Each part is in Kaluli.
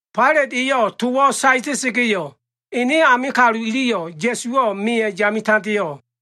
Failat eyo꞉ towo꞉ saeta꞉sa꞉ga꞉yo꞉, ene ame kalu iliyo꞉ Ya꞉suwo꞉ meya꞉ yame tandeo꞉.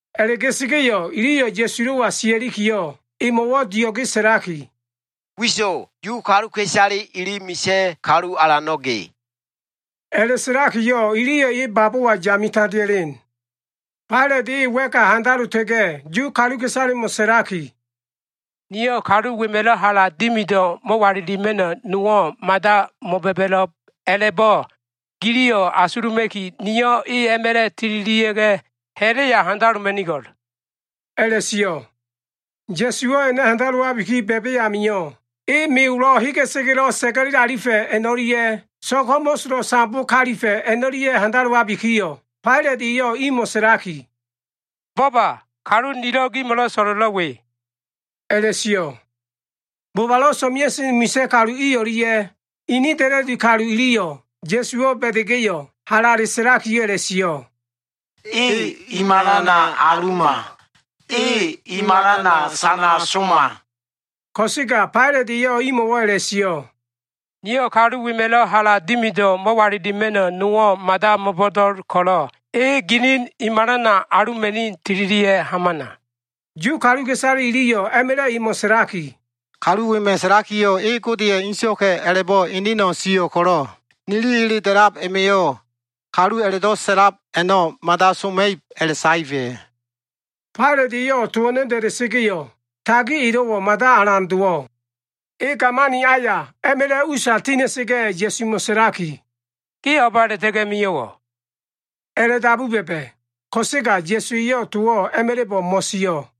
A꞉la꞉ga꞉sa꞉ga꞉yo꞉ iliyo꞉ Ya꞉sulo꞉wa sia꞉likiyo꞉, emo꞉wo꞉ dio꞉ge sa꞉laki, “Wiso꞉! Yu kaluka꞉isale ili misa꞉ kalu alano꞉ ge.” A꞉la꞉sa꞉lakiyo꞉, iliyo꞉ e babowa yame tandea꞉len. Failat e wa꞉ka handalota꞉ga꞉ Yu kaluka꞉isalemo꞉ sa꞉laki, “Niyo꞉ kalu wema꞉lo꞉ hala dimido꞉ mo꞉walilima꞉no꞉ nowo꞉ mada mo꞉ba꞉ba꞉lo꞉b a꞉la꞉bo꞉ giliyo꞉ asuluma꞉ki, niyo꞉ e a꞉ma꞉la꞉ tililia꞉ga꞉, ha꞉la꞉ya handaloma꞉nigo꞉l” a꞉la꞉sio꞉. Ya꞉suwo꞉ a꞉na handalowabiki ba꞉ba꞉ amio꞉, e me olo꞉ hegesa꞉ga꞉lo꞉ sa꞉ga꞉le alifa꞉ a꞉no꞉lia꞉, so꞉g ho꞉mo꞉solo꞉ sambo kalifa꞉ a꞉no꞉lia꞉ handalowabikiyo꞉, Failat eyo꞉ imo꞉ sa꞉laki, “Bo꞉ba! Kalu nilo꞉ gimo꞉lo꞉ so꞉lo꞉lo꞉ we” a꞉la꞉sio꞉. Bobalo꞉ so꞉mea꞉sen misa꞉ kalu i o꞉lia꞉ ini da꞉la꞉di kalu iliyo꞉ Ya꞉suwo꞉ ba꞉da꞉ga꞉yo꞉, halale sa꞉laki a꞉la꞉sio꞉, “E i malana aluma. E i malana sana soma.” Ko꞉sega Failat eyo꞉ imo꞉wo꞉ a꞉la꞉sio꞉, “Niyo꞉ kalu wema꞉lo꞉ hala dimido꞉ mo꞉walilima꞉no꞉ nowo꞉ mada mo꞉bo꞉do꞉l ko꞉lo꞉, e ginin i malana aluma꞉ni tililia꞉ hamana.” Yu kaluka꞉isale iliyo꞉ a꞉ma꞉la꞉ emo꞉ sa꞉laki, “Kalu wema꞉ sa꞉lakiyo꞉ e Godeya꞉ ene so꞉waka꞉ a꞉la꞉bo꞉ eneno꞉ sio꞉ ko꞉lo꞉, nili ele da꞉lab a꞉ma꞉yo꞉ kalu a꞉la꞉do꞉ sa꞉lab a꞉no꞉ mada soma꞉ib a꞉la꞉saefa꞉.” Failat eyo꞉ to a꞉no꞉ da꞉da꞉sa꞉ga꞉yo꞉, tagi elo꞉wo꞉ mada alan dowo꞉. E gamani aya a꞉ma꞉la꞉ usa tina꞉sa꞉ga꞉, Ya꞉sumo꞉ sa꞉laki, “Ge o꞉ba a꞉la꞉ta꞉ga꞉ mio꞉wo꞉?” a꞉la꞉dabu ba꞉ba꞉. Ko꞉sega Ya꞉su eyo꞉ towo꞉ a꞉ma꞉la꞉bo꞉ mo꞉sio꞉.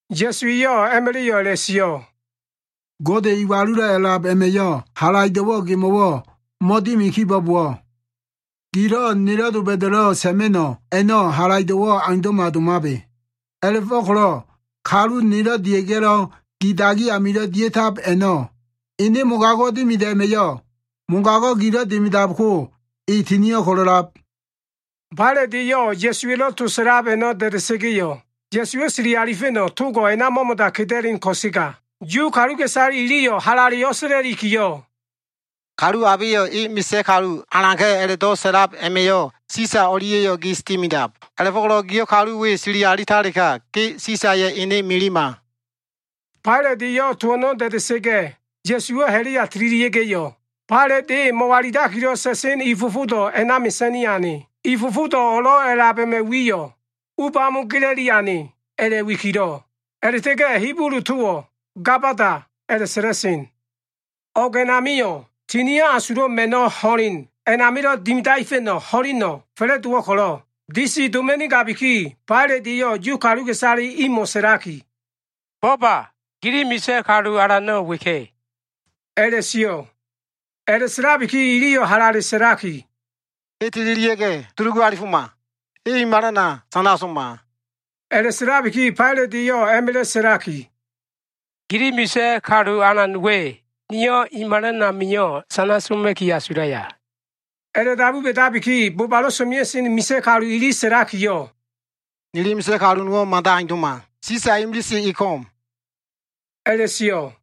Ya꞉su eyo꞉ a꞉ma꞉la꞉yo꞉ a꞉la꞉sio꞉, “Gode Iwalulo꞉ A꞉lab a꞉ma꞉yo꞉ halaido꞉wo꞉ gemo꞉wo꞉ mo꞉dimi kibo꞉bowo꞉, gilo꞉ nelo꞉ doba꞉da꞉lo꞉ sa꞉ma꞉no꞉ a꞉no꞉ halaido꞉wo꞉ aundo꞉ma domabe. A꞉la꞉fo꞉ko꞉lo꞉ kalu nelo꞉ dia꞉ga꞉lo꞉ gi dagi amilo꞉ dia꞉tab a꞉no꞉ ene mogago꞉ dimido꞉ a꞉ma꞉yo꞉, mogago꞉ gilo꞉ dimidab ko e tinio꞉ ko꞉lo꞉lab.” Failat eyo꞉ Ya꞉suwa꞉lo꞉ to sa꞉lab a꞉no꞉ da꞉da꞉sa꞉ga꞉yo꞉, Ya꞉suwo꞉ sili alifa꞉no꞉ togo꞉ a꞉na mo꞉mo꞉da keda꞉len ko꞉sega, Yu kaluka꞉isale iliyo꞉ halale o꞉sa꞉la꞉likiyo꞉, “Kalu abeyo꞉ e misa꞉ kalu alanka꞉ a꞉la꞉do꞉ sa꞉lab a꞉ma꞉yo꞉ Sisa o꞉lia꞉yo꞉ gis dimidab. A꞉la꞉fo꞉ko꞉lo꞉ giyo꞉ kalu we sili alitalega, ge Sisaya꞉ ene milima.” Failat eyo꞉ to a꞉no꞉ da꞉da꞉sa꞉ga꞉, Ya꞉suwo꞉ ha꞉la꞉ya tililia꞉ga꞉yo꞉, Failat e mo꞉walilakilo꞉ sa꞉sen i fofodo꞉ a꞉na mesa꞉ni ane. I fofodo꞉ o꞉lo꞉ a꞉lab a꞉ma꞉ wiyo꞉ “U bamo gela꞉li ane” a꞉la꞉wikilo꞉. A꞉la꞉ta꞉ga꞉ Hibulu towo꞉ “Gabada” a꞉la꞉sa꞉la꞉sen. O꞉g a꞉namio꞉ Tinio꞉ Asulo꞉ Ma꞉no꞉ ho꞉len a꞉namilo꞉ dimidaefa꞉no꞉ ho꞉leno꞉ fa꞉la꞉dowo꞉ ko꞉lo꞉ disi doma꞉nigabiki, Failat eyo꞉ Yu kaluka꞉isale imo꞉ sa꞉laki, “Bo꞉ba! Gili misa꞉ kalu alano꞉ weka꞉” a꞉la꞉sio꞉. A꞉la꞉sa꞉labiki iliyo꞉ halale sa꞉laki, “E tililia꞉ga꞉ dulugu alifoma. E i malana sana soma.” A꞉la꞉sa꞉labiki Failat eyo꞉ a꞉ma꞉la꞉ sa꞉laki, “Gili misa꞉ kalu alan we niyo꞉ i malana sana soma꞉no꞉wo꞉?” A꞉la꞉dabu ba꞉dabiki bobalo꞉ so꞉mea꞉sen misa꞉ kalu ili sa꞉lakiyo꞉, “Nili misa꞉ kalu nowo꞉ mada aundo꞉ma. Sisa imilise e ko꞉m” a꞉la꞉sio꞉.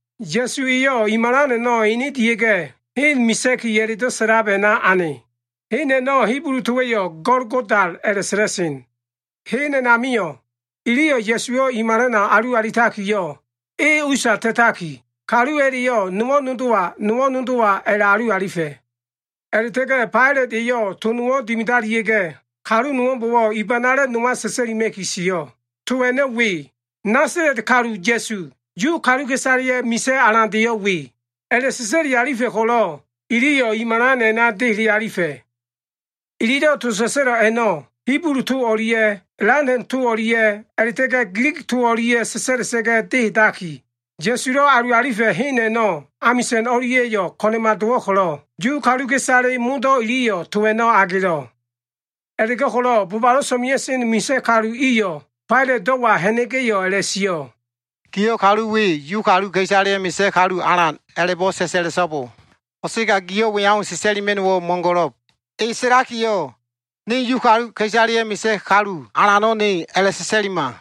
Ya꞉su eyo꞉ i malan a꞉no꞉ ene dia꞉ga꞉, Hen Misa꞉ki a꞉la꞉do꞉ sa꞉lab a꞉na ane. Hen a꞉no꞉ Hibulu towa꞉yo꞉ Golgoda a꞉la꞉sa꞉la꞉sen. Hen a꞉namio꞉, iliyo꞉ Ya꞉suwo꞉ i malana alu alitakiyo꞉, e usa ta꞉taki, kalu a꞉la꞉yo꞉, nowo꞉ nodowa, nowo꞉ nodowa a꞉la꞉alu alifa꞉. A꞉la꞉ta꞉ga꞉ Failat eyo꞉ to nowo꞉ dimidalia꞉ga꞉, kalu nowo꞉mbo꞉wo꞉ i banale nowa sa꞉sa꞉lima꞉ki sio꞉. To a꞉no꞉ we, Nasala꞉t kalu Ya꞉su, Yu kaluka꞉isaleya꞉ Misa꞉ Kalu Alandeyo꞉ we a꞉la꞉sa꞉sa꞉li alifa꞉ ko꞉lo꞉, iliyo꞉ i malan a꞉na dehele alifa꞉. Ililo꞉ to sa꞉sa꞉lo꞉ a꞉no꞉ Hibulu to o꞉lia꞉ Latin to o꞉lia꞉ a꞉la꞉ta꞉ga꞉ Gilig to o꞉lia꞉ sa꞉sa꞉la꞉sa꞉ga꞉ dehedakiyo꞉, Ya꞉sulo꞉ alu alifa꞉ hen a꞉no꞉ amisa꞉n o꞉lia꞉yo꞉ ko꞉na꞉ma dowo꞉ ko꞉lo꞉, Yu kaluka꞉isale modo꞉ iliyo꞉ to a꞉no꞉ agelo꞉. A꞉la꞉go꞉ko꞉lo꞉ bobalo꞉ so꞉mea꞉sen misa꞉ kalu iyo꞉ Failatdo꞉wa ha꞉na꞉ga꞉yo꞉ a꞉la꞉sio꞉, “Giyo꞉ kalu we ‘Yu kaluka꞉isaleya꞉ Misa꞉ Kalu Alan’ a꞉la꞉bo꞉ sa꞉sa꞉la꞉so꞉bo. Ko꞉sega giyo꞉ we au sa꞉sa꞉lima꞉no꞉wo꞉ mo꞉go꞉lo꞉b, ‘E sa꞉lakiyo꞉ Ne Yu kaluka꞉isaleya꞉ Misa꞉ kalu Alano꞉ Ne’ a꞉la꞉sa꞉sa꞉lima.”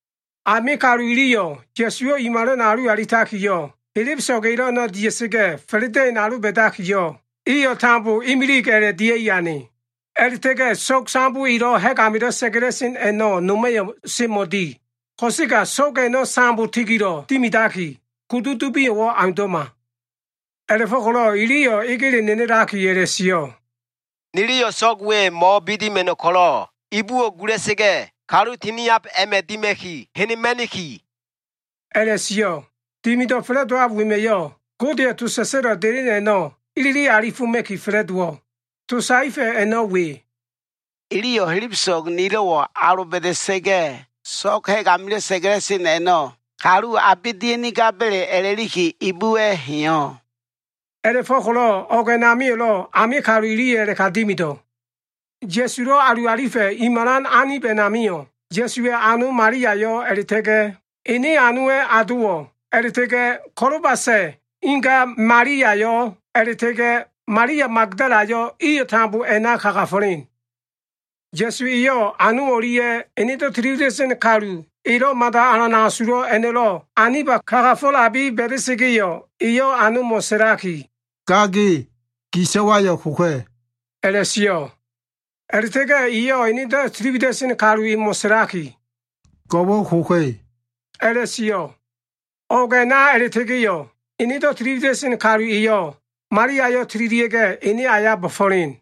Ame kalu iliyo꞉ Ya꞉suwo꞉ i malana alu alitakiyo꞉, helebeso꞉g elo꞉ a꞉no꞉ dia꞉sa꞉ga꞉ fa꞉la꞉da꞉in aloba꞉dakiyo꞉, iyo꞉ tambo imilig a꞉la꞉ dia꞉i ane. A꞉la꞉ta꞉ga꞉ so꞉g sambo elo꞉ ha꞉g amilo꞉ sa꞉ga꞉la꞉sen a꞉no꞉ noma꞉yo꞉ semo꞉di. Ko꞉sega so꞉g a꞉no꞉ sambo tigilo꞉ dimidaki, kudu dubio꞉wo꞉ aundo꞉ma. A꞉la꞉fo꞉ko꞉lo꞉ iliyo꞉ egele nenelakiyo꞉ a꞉la꞉sio꞉, “Niliyo꞉ so꞉g we mo꞉bidima꞉no꞉ ko꞉lo꞉, ibuwo꞉ gula꞉sa꞉ga꞉ kalu tiniab a꞉ma꞉ dima꞉ki henema꞉niki” a꞉la꞉sio꞉. Dimido꞉ fa꞉la꞉dowab wema꞉yo꞉ Godeya꞉ to sa꞉sa꞉lo꞉ delen a꞉no꞉ ilili alifoma꞉ki fa꞉la꞉dowo꞉. To saefa꞉ a꞉no꞉ we, “Iliyo꞉ helebeso꞉g nilo꞉wo꞉ aloba꞉da꞉sa꞉ga꞉, so꞉g ha꞉g amilo꞉ sa꞉ga꞉la꞉sen a꞉no꞉ kalu abe dia꞉nigaba꞉le a꞉la꞉likiyo꞉ ibuwa꞉ heyo꞉.” A꞉la꞉fo꞉ko꞉lo꞉ o꞉g a꞉namio꞉lo꞉ ame kalu iliyo꞉ a꞉la꞉ka dimido꞉. Ya꞉sulo꞉ alu alifa꞉ i malan anib a꞉namio꞉, Ya꞉suwa꞉ ano Maliayo꞉, a꞉la꞉ta꞉ga꞉ ene anowa꞉ adowo꞉, a꞉la꞉ta꞉ga꞉ Kolobasa꞉ inga Maliayo꞉, a꞉la꞉ta꞉ga꞉ Malia Magdalayo꞉ iyo꞉ tambo a꞉na kagafo꞉len. Ya꞉su eyo꞉ ano o꞉lia꞉, enedo꞉ tiliwida꞉sen kalu elo꞉ mada alan asulo꞉ a꞉no꞉lo꞉ aniba kagafo꞉labi ba꞉da꞉sa꞉ga꞉yo꞉, eyo꞉ anomo꞉ sa꞉laki, “Ga ge, gi so꞉wayo꞉ koka꞉” a꞉la꞉sio꞉. A꞉la꞉ta꞉ga꞉ eyo꞉ enedo꞉ tili wida꞉sen kalu emo꞉ sa꞉laki, “Go꞉wo꞉ koka꞉” a꞉la꞉sio꞉. O꞉g a꞉na a꞉la꞉ta꞉ga꞉yo꞉, enedo꞉ tiliwida꞉sen kalu eyo꞉ Maliayo꞉ tililia꞉ga꞉, ene aya bo꞉fo꞉len.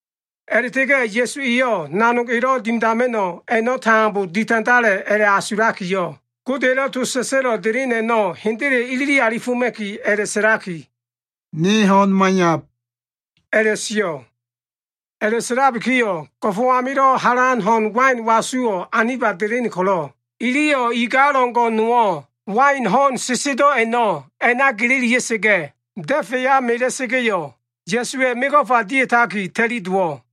A꞉la꞉ta꞉ga꞉ Ya꞉su eyo꞉ nanog elo꞉ dimidama꞉no꞉ a꞉no꞉ tambo ditandala꞉ a꞉la꞉asulakiyo꞉, Godeya꞉lo꞉ to sa꞉sa꞉lo꞉ delen a꞉no꞉ hendele ilili alifa꞉no꞉ a꞉lakiyo꞉, “Ne ho꞉n maiyab” a꞉la꞉sio꞉. A꞉la꞉sa꞉labikiyo꞉ go꞉fo꞉ amilo꞉ halan ho꞉n wain wasuwo꞉ anib a꞉na delen ko꞉lo꞉, iliyo꞉ igal o꞉ngo꞉ nowo꞉ wain ho꞉n sesedo꞉ a꞉no꞉ a꞉na gelelia꞉sa꞉ga꞉, da꞉fa꞉ya mela꞉sa꞉ga꞉yo꞉, Ya꞉suwa꞉ mego꞉fa dia꞉taki ta꞉li dowo꞉.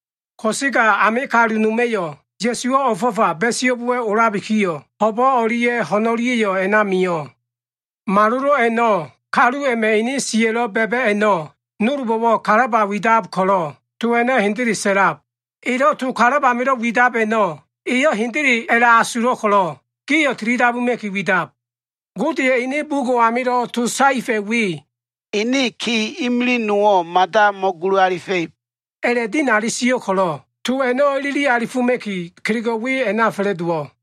Ko꞉sega ame kalu noma꞉yo꞉ Ya꞉suwo꞉ o꞉fo꞉fa ba꞉iso꞉bowa꞉ olabikiyo꞉, ho꞉bo꞉ o꞉lia꞉ ho꞉n o꞉lia꞉yo꞉ a꞉na mio꞉. Malolo꞉ a꞉no꞉ kalu a꞉ma꞉ ene siya꞉lo꞉ ba꞉ba꞉ a꞉no꞉ nolbo꞉wo꞉ kalaba widab ko꞉lo꞉, to a꞉no꞉ hendele sa꞉lab. Eyo꞉ to kalab amilo꞉ widab a꞉no꞉ eyo꞉ hendele a꞉la꞉asulo꞉ ko꞉lo꞉, gio꞉ tilidabuma꞉ki widab. Godeya꞉ ene bugo꞉ amilo꞉ to saefa꞉yo꞉ we, “Ene ki imilig nowo꞉ mada mo꞉gulu alifa꞉ib” a꞉la꞉dinali sio꞉ ko꞉lo꞉, to a꞉no꞉ ilili alifoma꞉ki, kelego꞉ we a꞉na fa꞉la꞉dowo꞉.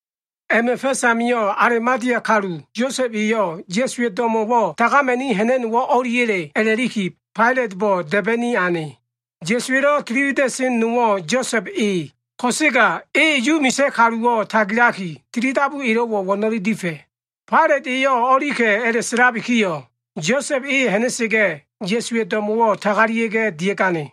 A꞉ma꞉ fa꞉s amio꞉ Alimatea kalu Yosa꞉b eyo꞉ Ya꞉suwa꞉ do꞉mo꞉wo꞉ tagama꞉ni ha꞉na꞉no꞉wo꞉ o꞉liya꞉le a꞉la꞉liki Failatbo꞉ da꞉ba꞉ni ane. Ya꞉suwa꞉lo꞉ tili wida꞉seno꞉ nowo꞉ Yosa꞉b e, ko꞉sega e Yu misa꞉ kaluwo꞉ tagilaki, tili dabu elo꞉wo꞉ wo꞉no꞉le difa꞉. Failat eyo꞉ o꞉lika꞉ a꞉la꞉sa꞉labikiyo꞉, Yosa꞉b e ha꞉na꞉sa꞉ga꞉ Ya꞉suwa꞉ do꞉mo꞉wo꞉ tagalia꞉ga꞉ dia꞉gane.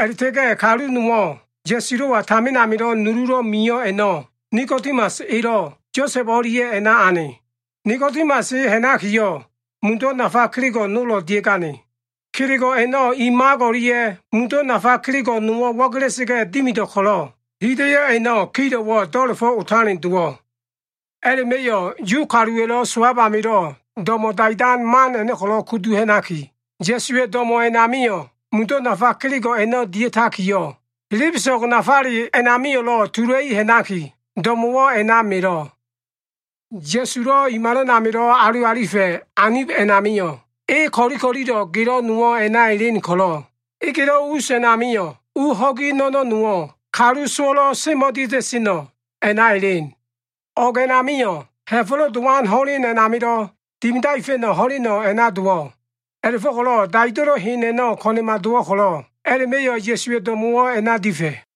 A꞉la꞉ta꞉ga꞉ kalu nowo꞉, Ya꞉sulo꞉wa tamin amilo꞉ nululo꞉ mio꞉ a꞉no꞉, Nikodimas elo꞉ Yosa꞉b o꞉lia꞉ a꞉na ane. Nikodimas e ha꞉nakiyo꞉, mundo꞉ nafa kelego꞉ nolo꞉ dia꞉gane. Kelego꞉ a꞉no꞉ i mak o꞉lia꞉ mundo꞉ nafa kelego꞉ nowo꞉ wo꞉gela꞉sa꞉ga꞉ dimido꞉ ko꞉lo꞉, hida꞉yo꞉ a꞉no꞉ kilowo꞉ do꞉la꞉fo꞉ otalen dowo꞉. A꞉la꞉ma꞉yo꞉ Yu kaluwa꞉lo꞉ sowab amilo꞉ do꞉mo꞉ daidan man a꞉no꞉ ko꞉lo꞉ kudu ha꞉naki, Ya꞉suwa꞉ do꞉mo꞉ a꞉namio꞉ mundo꞉ nafa kelego꞉ a꞉no꞉ dia꞉takiyo꞉, helebeso꞉g nafale a꞉namio꞉lo꞉ tula꞉i ha꞉naki, do꞉mo꞉wo꞉ a꞉na melo꞉. Ya꞉sulo꞉ i malan amilo꞉ alu alifa꞉ anib a꞉namio꞉, e ko꞉li ko꞉lilo꞉lo꞉ gelo꞉ nowo꞉ a꞉na elen ko꞉lo꞉, egelo꞉ us a꞉namio꞉, u ho꞉gi no꞉no꞉ nowo꞉, kalu sowo꞉lo꞉ semo꞉dia꞉ta꞉seno꞉ a꞉na elen. O꞉g a꞉namio꞉ Ha꞉fo꞉lo꞉ Dowan ho꞉len a꞉namilo꞉ dimidaefa꞉no꞉ ho꞉leno꞉ a꞉na dowo꞉. A꞉la꞉fo꞉ko꞉lo꞉ daido꞉lo꞉ hen a꞉no꞉ ko꞉na꞉ma dowo꞉ ko꞉lo꞉, a꞉la꞉ma꞉yo꞉ Ya꞉suwa꞉ do꞉mo꞉wo꞉ a꞉na difa꞉.